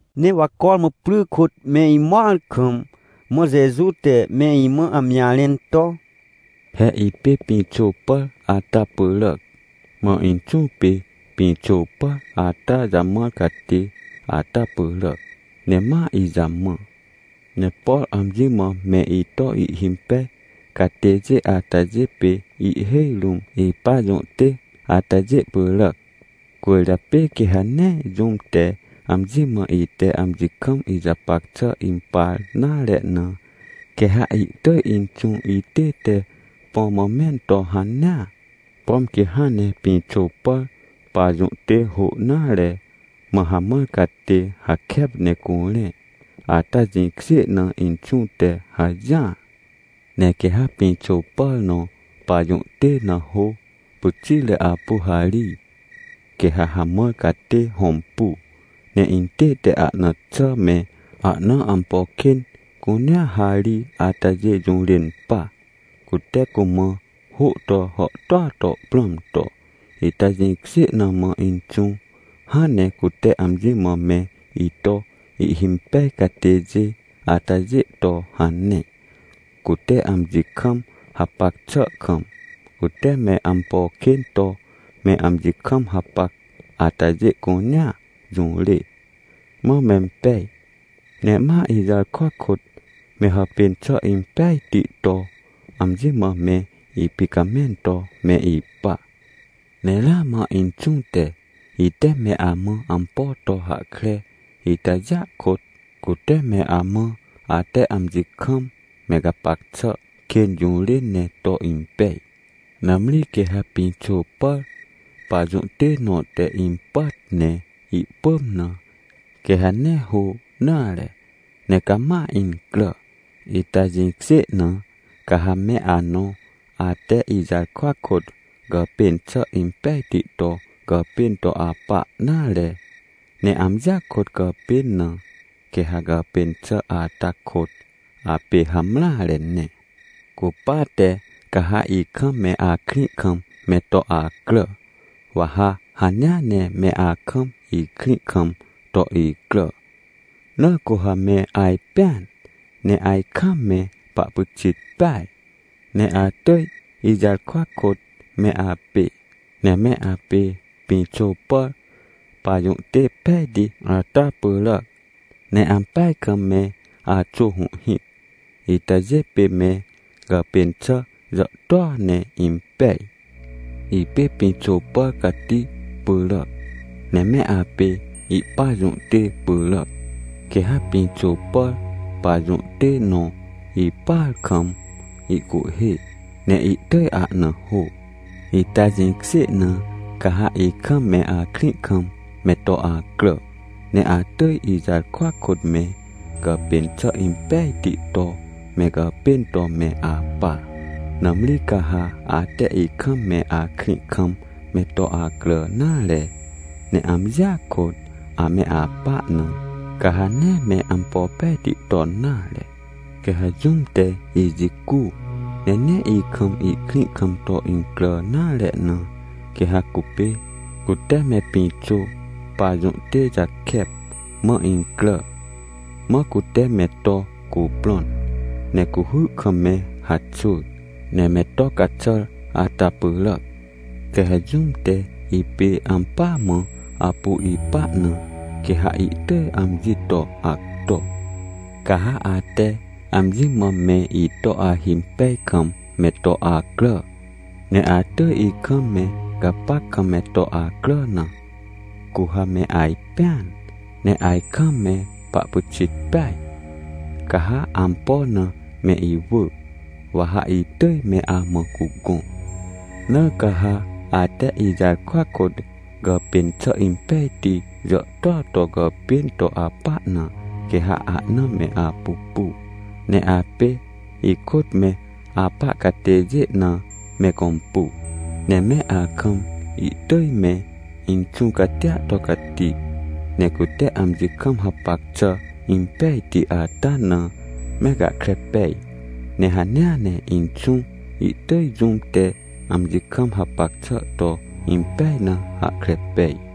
Ne wa cormã pry kôt me imõar kam, mã Jeju te me imã amji jarẽn to: — He ipê pĩxô pàr ata pyràac, mã Inxũ pê pĩxô pàr ata jamãr catê ata pyràac, ne ma ijamã. Ne por amji mã me ito ihhimpej catêjê atajê pê ihhêj rũm ipajũhtê atajê pyràac. Cwỳrjapê quê ha nee jũm te amji mã ite amji kam ijapac xà impar nare na, quê ha ihtỳj Inxũ itête põ mã mẽn to hanea, pom quê hãn ne pĩxô pàr pajũhtê hô nare, mã hamãr catê hakep ne curẽ, ata jĩkjê na Inxũ te hajỹar. Ne quê ha pĩxô pàr nõ pajũhtê na hô pyxitre apu harij, quê ha hamãr catê hõmpu, ne intête ahna xà me, ahna ampo kên cunea harij atajê jũrên pa, cute cumã hô to hàhtôa to prãm to. Ita jĩkjê na mã Inxũ hãn ne cute amji mã me ito ihhimpej catêjê atajê to hane. Cute amji kam hapac xà kam, cute me ampo kên to me amji kam hapac atajê cunea jũrê, mã mempej, ne ma ijarkwa kôt, me hàpên xà impejti to amji mã me ipicamẽn to me ipa. Ne ramã Inxũ te, ite me amã ampo to hahkre itajêa kôt, cute me amã ate amji kam me gapac xà kên jũrên ne to impej. Nãmri quê ha pĩxô pàr pajũhtê nõ te impàt ne ihpỳm na, quê ha nee hô nare, ne cama incrà. Ita jĩkjê na, ca ha me anõ, ate ijarkwa kôt gàpên xà impejti to gàpên to apa nare, ne amjia kôt gàpên na, quê ha gàpên xà ata kôt apê hamreare ne. Cupate ca ha ikam me akrĩ kam me to acrà, wa ha hanea ne me akam ikrĩ kam to icrà. Na cu ha me ajpẽan, ne ajkam me pahpyxit peaj, ne atỳj ijarkwa kôt me apê. Ne me apê pĩxô pàr pajũhtê pejti ata pyràac, ne ampeaj kam me axô hũhhĩc itajê pê me gàpên xà jàhtôa ne impej. — Ipê pĩxô pàr cati pyràac, ne me apê ihpajũhtê pyràac. Quê ha pĩxô pàr pajũhtê nõ ipàar kam ihcuhhê, ne ihtỳj ahna hô. Ita jĩkjê na, ca ha ikam me akrĩ kam me to acrà, ne atỳj ijarkwa kôt me gàpên xà impejti to me gàpên to me apa. Nãmri ca ha ate ikam me akrĩ kam me to acrà nare, ne amjia kôt ame apa na, ca ha nee me ampo pejti ton nare. Quê ha jũm te ijicu, ne nee ikam ihkrĩ kam to incrà nare na, quê ha cupê, cute me pĩxô pajũhtê jakep mã incrà, mã cute me to cuprõn, ne cuhy kam me haxwỳr, ne me to caxàr ata pyràac. Quê ha jũm te ipê ampỳa mã apu ipa na, quê ha ihtỳj amji to acto. Ca ha ate amji mã me ito ahimpej kam me to acrà, ne atỳj ikam me gapac kam me to acrà na, cu ha me ajpẽan, ne ajkam me pahpyxit peaj, ca ha ampo na me iwỳ, wa ha itỳj me amã cugõ. Na ca ha ate ijarkwa kôt gàpên xà impejti jàhtôa to gàpên to apa na, quê ha ahna me apupu, ne apê ikôt me apa catêjê na me gõmpu, ne me akam ihtỳj me Inxũ catia to cati. Ne cute amji kam hapac xà impejti ata na me gahkre pej, ne hanea ne Inxũ, ihtỳj jũm te amji kam hapac xà to impej na hahkre pej.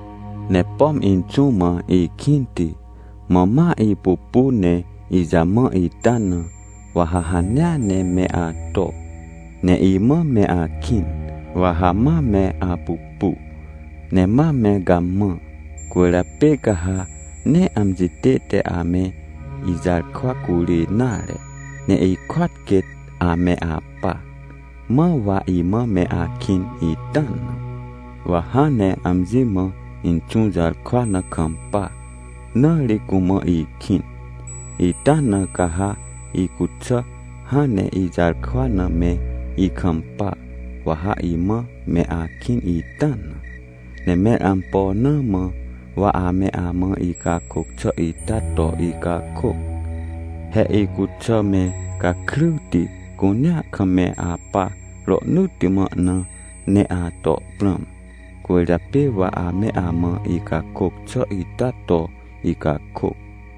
— Ne pom Inxũ mã ikĩnti, mã ma ipupu ne ijamã ita na, wa ha hanea ne me ato, ne imã me akĩn, wa ha ma me apupu, ne ma me gamã. Cwỳrjapê ca ha nee amji tête ame ijarkwa curê nare, ne ikôat quêt ame apa, mãr wa imã me akĩn ita na. Wa hãn ne amji mã Inxũ jarkwa na kampa, na ri cumã ikĩn, ita na ca ha icuxà hãn ne ijarkwa na me ikampa, wa ha imã me akĩn ita na. — Ne mẽr ampo na mã wa ame amã icakôc xà ita to icakôc? He icuxà me gakryti cunea kam me apa rohnỳtti mã na me ato prãm, cwỳrjapê wa ame amã icakôc xà ita to icakôc.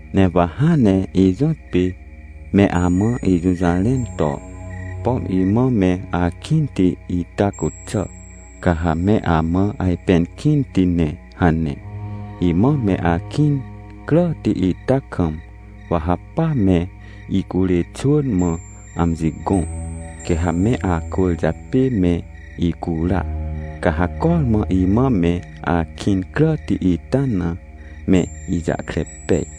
— Ne wa hãn ne ijõtpê me amã ijũjarẽn to: “Pom imã me akĩnti ita cuxà, ca ha me amã ajpẽn kĩnti ne” hane. Imã me akĩn cràti ita kam, wa ha pa me icurê xwỳn mã amji gõ, quê ha me acwỳrjapê me icura. Ca ha cormã imã me akĩn cràti ita na me ijahkre pej.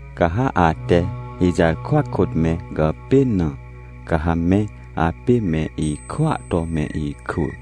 — Ca ha ate ijarkwa kôt me gàpên na, ca ha me apê me ikwỳa to me ikwỳ.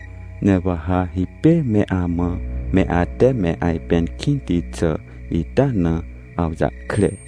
Ne wa ha hipêr me amã me ate me ajpẽn kĩnti xà ita na awjahkre.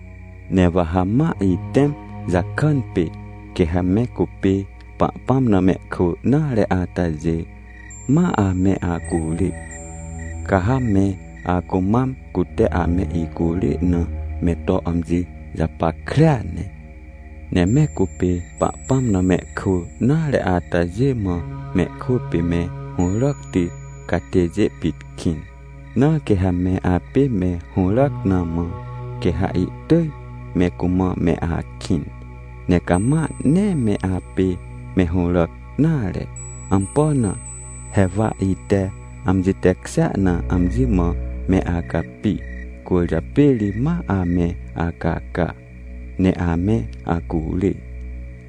— Ne wa ha ma itẽm jakàn pê, quê ha me cupê Pahpãm na mehkwỳ nare atajê, ma ame acurê. Ca ha me acumam cute ame icurê na me to amji japackrea ne. Ne me cupê Pahpãm na mehkwỳ nare atajê mã mehkwỳ pê me hũràcti catêjê pit kĩn. Na quê ha me apê me hũràc na mã, quê ha ihtỳj me cumã me akĩn. Ne cama nee me apê me hũràc nare. Ampo na? He wa ite amji tekjêa na amji mã me acapi. Cwỳrjapê ri ma ame acaca ne ame acurê.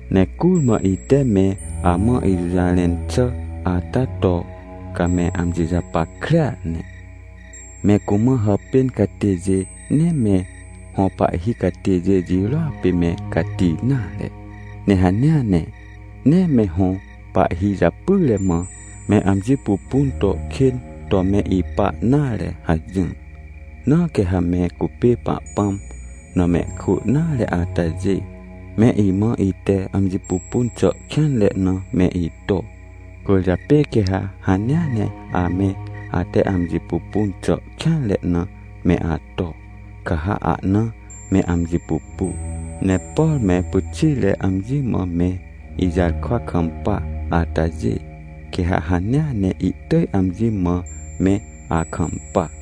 Ne curmã ite me amã ijũjarẽn xà ata to ca me amji japackrea ne. “Me cumã hàpên catêjê, nee me hõ pahhi catêjê jirôa pê me cati nare. Ne hanea ne nee me hõ pahhi japyre mã, me amji pupun to kên to me ipa nare” hajỹr. Na quê ha me cupê Pahpãm na mehkwỳ nare atajê, me imã ite amji pupun xà kêanre na me ito. Cwỳrjapê quê ha hanea ne ame ate amji pupun xà kêanre na me ato, ca ha ahna me amji pupu. Ne por me pyxitre amji mã me ijarkwa kampa atajê, quê ha hanea ne ihtỳj amji mã me akampa.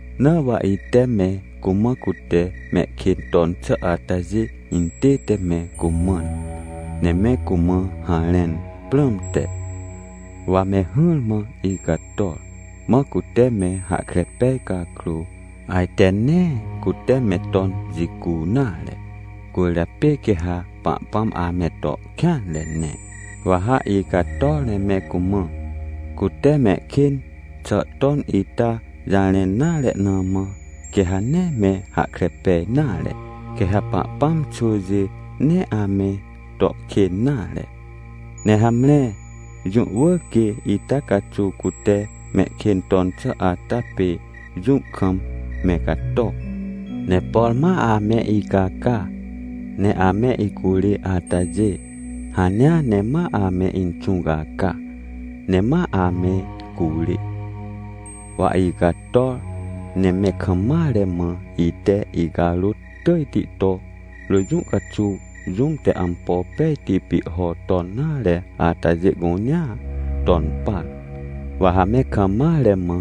— Na wa ite me cumã cute mehkên ton xà atajê intête me cumãn, ne me cumã harẽn prãmte, wa me hỹrmã icator. Mã cute me hahkre pej cakrô, ajte nee cute me ton jicu nare. Cwỳrjapê quê ha Pahpãm ame to kêanre ne. Wa ha icator ne me cumã, cute mehkên xà ton ita jarẽn nare na mã, quê ha nee me hahkre pej nare, quê ha Pahpãm xwỳjê nee ame to kên nare. Ne hamre, jũ wỳr quê ita caxuw, cute mehkên ton xà ata pê jũ kam me cato. Ne por ma ame icaca, ne ame icurê atajê, hanea ne ma ame Inxũ caca ne ma ame curê. Wa icator, ne me kam mare mã ite icarôt tỳjti to, rỳ jũ caxuw jũm te ampo pejti pihho ton nare atajê cunea ton par. Wa ha me kam mare mã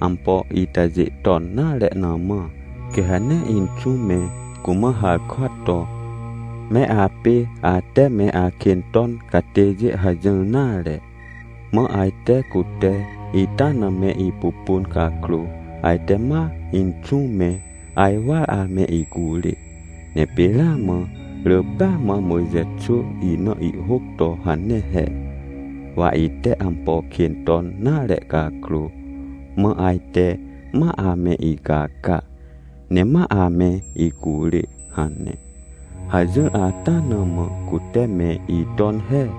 ampo itajê ton nare na mã, quê ha nee Inxũ me cumã harkwa to: “Me apê ate me akên ton catêjê” hajỹr nare. Mã ajte cute ita na me ipupun cakrô, ajte ma Inxũ me ajwar ame icurê. Ne pê ramã rỳ pêa mã Mojxe xwỳ ina ihhôc to hane he: “Wa ite ampo kên ton nare cakrô, mã ajte ma ame icaca, ne ma ame icurê” hane. Hajỹr ata na mã cute me iton he.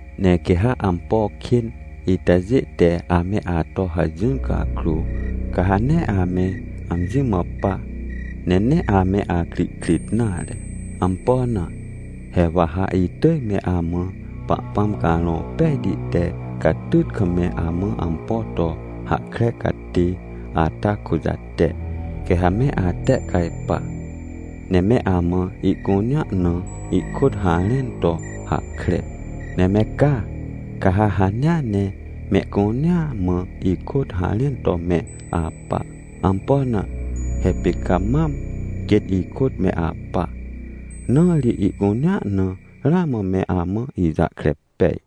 — Ne quê ha ampo kên itajê te ame ato hajỹr cakrô, ca ha nee ame amji mã pa, ne nee ame akrihkrit nare. Ampo na? He wa ha itỳj me amã Pahpãm Carõ Pejti te catyt kam me amã ampo to hahkre catê ata kujate. Quê ha me atehcajpa, ne me amã ihcunea na ikôt harẽn to hahkre. Ne me ca, ca ha hanea ne mehcunea mã ikôt harẽn to me apa. Ampo na? He pê ca mam quêt ikôt me apa, na ri ihcunea na ramã me amã ijahkre pej.